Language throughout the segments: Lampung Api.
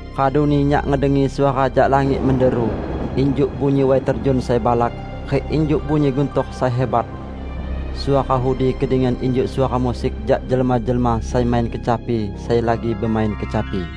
Raduni nyak ngedengi suara jak langit menderu injuk bunyi way terjun sai balak rik injuk bunyi guntor sai hibat. Suara udi kedengian injuk suara musik jak jelma-jelma sai main kecapi sai lagi bemain kecapi.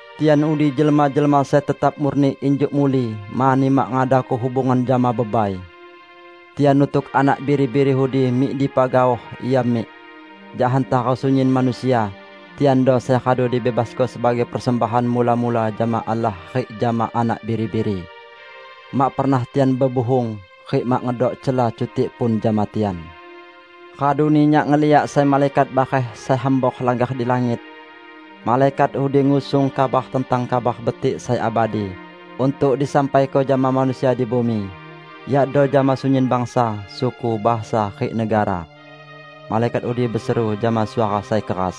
Tian udi jelma-jelma sai tetap murni injuk muli, mani mak ngadako hubungan jama bebai. Tian nutuk anak Biri-biri udi mik dipa gaoh ia mik. Jak hantara sunyin manusia, tiando sai radu dibebasko sebagai persembahan mula-mula jama Allah rik jama Anak Biri-biri. Mak pernah tian bebuhung; rik mak ngedok cela cutik pun jama tian. Raduni nyak ngeliak sai malaikat bareh sai hambor langgar di langit. Malaikat udi ngusung kabar tentang Kabar Betik sai abadi untuk disampaiko jama manusia di bumi yakdo jama sunyin bangsa, suku, bahasa rik negara. Malaikat udi beseru jama suara sai keras,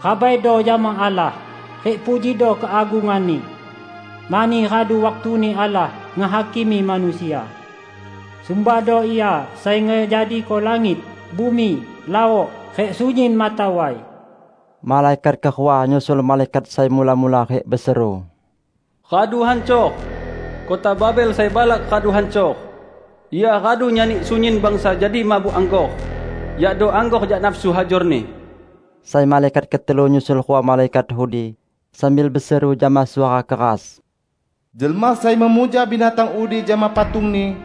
"Rabaido jama Allah, rik pujido keagungan-Ni! Mani radu waktuni Allah ngehakimi manusia. Sumbahdo Ia sai ngejadiko langit, bumi, laok rik sunyin mata way!" Malaikat kerua nyusul malaikat sai mula-mula rik beseru, "Radu hancor! Kota Babel sai balak radu hancor! Ia radu nyani sunyin bangsa jadi mabuk anggor -- yakdo anggor jak nafsu hajorni!" Sai malaikat ketelu nyusul rua malaikat udi, sambil beseru jama suara keras, "Jelma sai memuja binatang udi jama patungni,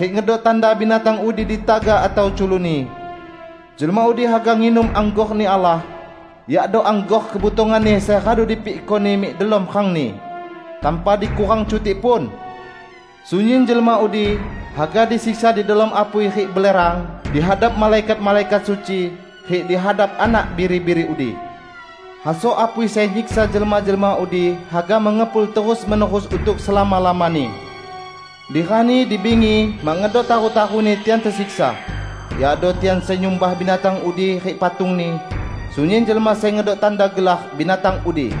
rik ngedok tanda binatang udi di tagak atau culukni, jelma udi haga nginum anggor-Ni Allah, yakdo anggor kebutongan-Ni sai radu dipikko-Ni mik delom rangni, tanpa dikurang cutik pun! Sunyin jelma udi haga disiksa di delom apui rik belerang di hadap malaikat-malaikat suci rik di hadap Anak Biri-biri udi. Hasok apui sai nyiksa jelma-jelma udi haga mengepul terus-menerus untuk selama-lamani. Di rani di bingi mak ngedok taru-taruni tian tesiksa, yakdo tian sai nyumbah binatang udi rik patungni, sunyin jelma sai ngedok tanda gelar binatang udi."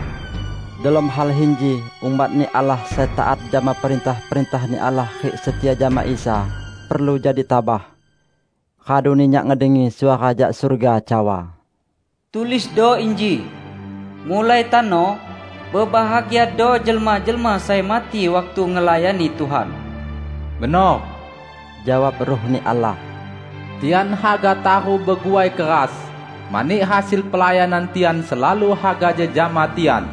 Delom hal inji umat-Ni Allah sai taat jama perintah-perintah-Ni Allah rik setia jama Isa, perlu jadi tabah. Raduni nyak ngedengi suara jak surga cawa, "Tulisdo inji: Mulai tano, bebahagiado jelma-jelma sai mati waktu ngelayani Tuhan!" "Benor!" jawab Ruh-Ni Allah. "Tian haga taru beguai keras, mani hasil pelayanan tian selalu haga jejama tian."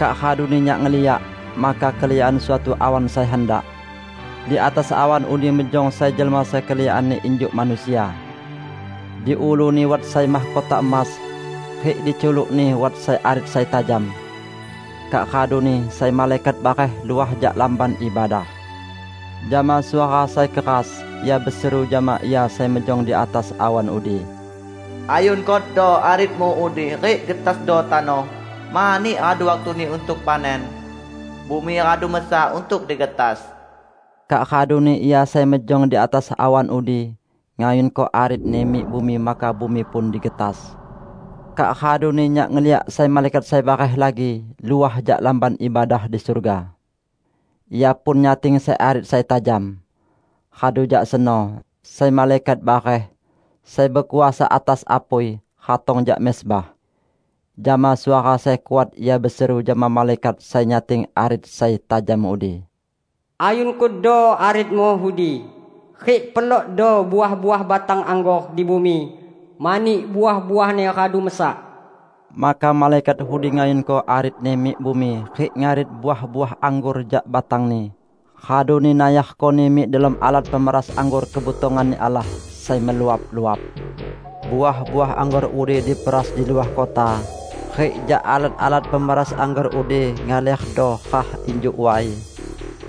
Kak raduni nyak ngeliak, maka keliakan suatu awan sai handak. Di atas awan udi mejong sai jelma sai keliakanni injuk manusia. Di ulu-Ni wat sai mahkota emas, rik diculuk-Ni wat sai arit sai tajam. Kak raduni sai malaikat bareh luah jak Lamban Ibadah. Jama suara sai keras, ia beseru jama Ia sai mejong di atas awan udi, "Ayunkodo arit-Mu udi rik getasdo tano, mani radu waktuni untuk panen; bumi radu mesak untuk digetas." Kak raduni Ia sai mejong di atas awan udi ngayunko arit-Ni mik bumi maka bumi pun digetas. Kak raduni nyak ngeliak sai malaikat sai bareh lagi luah jak Lamban Ibadah di surga. Ia pun nyating sai arit sai tajam. Radu jak seno, sai malaikat bareh, sai bekuasa atas apui, ratong jak mezbah. Jama suara sai kuat ia beseru jama malaikat sai nyating arit sai tajam udi, "Ayunkodo aritmu udi rik pelokdo uah-uah batang anggor di bumi, mani uah-uahni radu mesak!" Maka malaikat udi ngayunko aritni mik bumi rik ngarit uah-uah anggor jak batangni, raduni nayarkoni mik delom alat pemeras anggor kebutongan-Ni Allah sai meluap-luap. Uah-uah anggor udi diperas di luah kota, rik jak alat-alat pemeras anggor udi ngalerdo rah injuk way,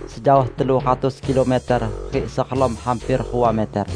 sejaoh telu ratus kilometer, rik serelom hamper rua meter.